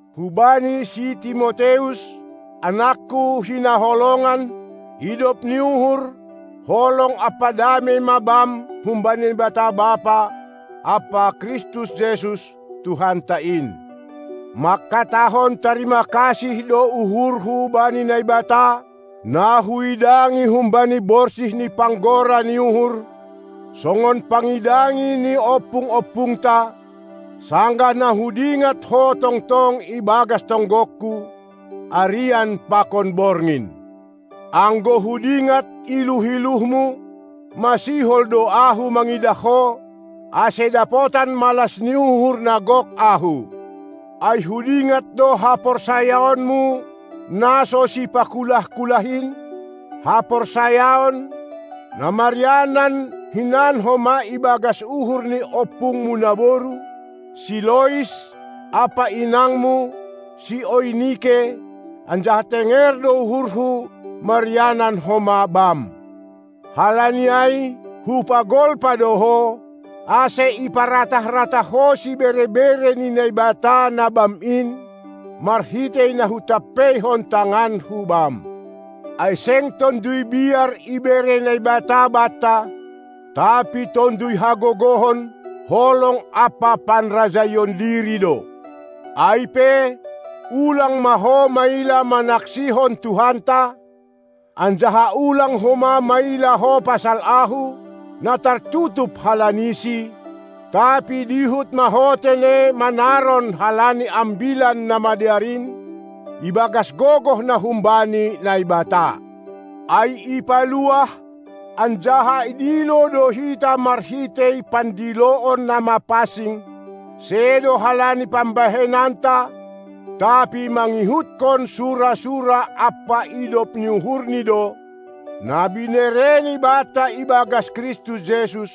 Hubani si Timoteus, anakku na hinaholongan: idop ni uhur, holong ampa damei ma bam humbani Naibata Bapa ampa Kristus Jesus, Tuhanta in. Mangkatahon tarima kasih do uhurhu bani Naibata, na huidangi humbani borsih ni panggora ni uhur, songon pangidangi ni ompung-ompungta, sanggah na hudingat ho tongtong ibagas tonggongku, arian pakon borngin. Anggo hudingat iluh-iluhmu, ma sihol do ahu mangidah ho, ase dapotan malas ni uhur na gok ahu. Ai hudingat do haporsayaonmu na so sipakulah-kulah in, haporsayaon, na marianan hinan homa ibagas uhur ni ompungmu naboru, si Lois, ampa inangmu, si Oinike, anjaha tenger do uhurhu, marianan homa bam. Halani ai, hupagolpa do ho, ase iparatah-ratah ho sibere-bere ni Naibata, na bam in, marhitei na hutampeihon tanganku bam. Ai seng tonduy biar ibere Naibata banta, tapi tonduy hagogohon, holong ampa panrajaion diri do. Ai pe, ulang ma ho maila manaksihon Tuhanta, anjaha ulang homa maila ho pasal ahu, na tartutup halanisi; tapi dihut ma ho tene manaron halani Ambilan Namadear in ibagas gogoh na humbani Naibata. Ai ipaluah anjaha idilo do hita marhitei pandiloon na mapansing, sedo halani pambahenanta, tapi mangihutkon sura-sura ampa idop ni uhurni do, na binereni banta ibagas Kristus Jesus,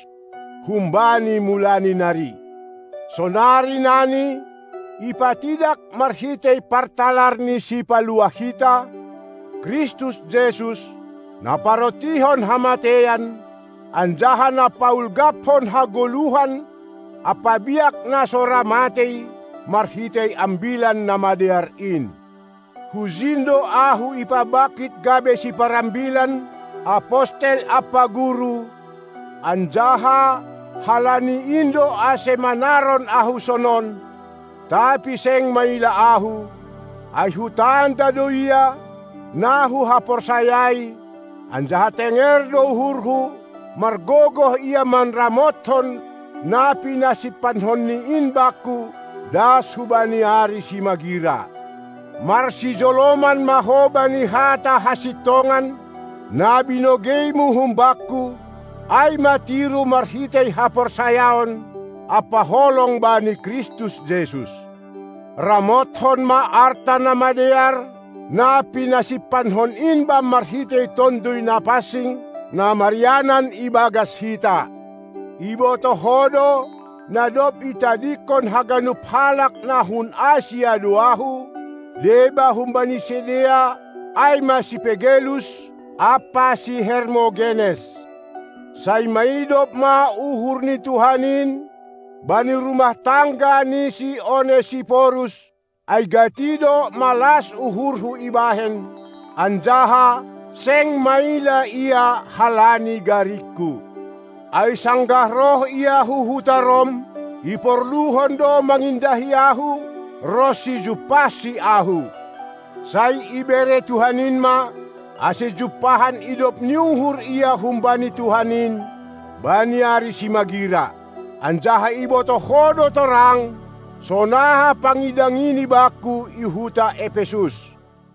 humbani mulani nari; sonari nani, ipatidak marhitei partalar ni Sipaluah hita, Kristus Jesus, na parontihon hamateian, anjaha na paulgaphon hagoluhan ampa biak na so ra matei marhitei Ambilan Namadear in. Hujin do ahu ipabangkit gabe siparambilan, apostel ampa guru, anjaha halani in do ase manaron ahu sonon; tapi seng maila ahu, ai hutanda do Ia, na huhaporsayai, anjaha tenger do uhurhu, margogoh Ia manramothon na pinasimpanhonNi in bakku das hubani ari simagira. Marsijoloman ma ho bani hata hasintongan, na binogeimu humbakku; ai ma tiru marhitei haporsayaon ampa holong bani Kristus Jesus. Ramothon ma arta na madear, na pinasimpanhon in bam marhitei Tonduy Napansing, na marianan ibagas hita. Ibotoh ho do, na dob itadingkon haganup halak na hun Asia do ahu, deba humbani sidea ai ma si Pegelus ampa si Hermogenes. Sai maidop ma uhur ni Tuhan in bani rumah tangga ni si Onesiporus, ai gati do malas uhurhu ibahen, anjaha seng maila ia halani garingku. Ai sanggah roh ia hu huta Rom, iporluhon do mangindahi ahu, ronsi jumpahsi ahu. Sai ibere Tuhan in ma, ase jumpahan idop ni uhur ia humbani Tuhan in bani ari simagira. Anjaha ibotoh ho do torang, sonaha pangidangini bakku i huta Epesus.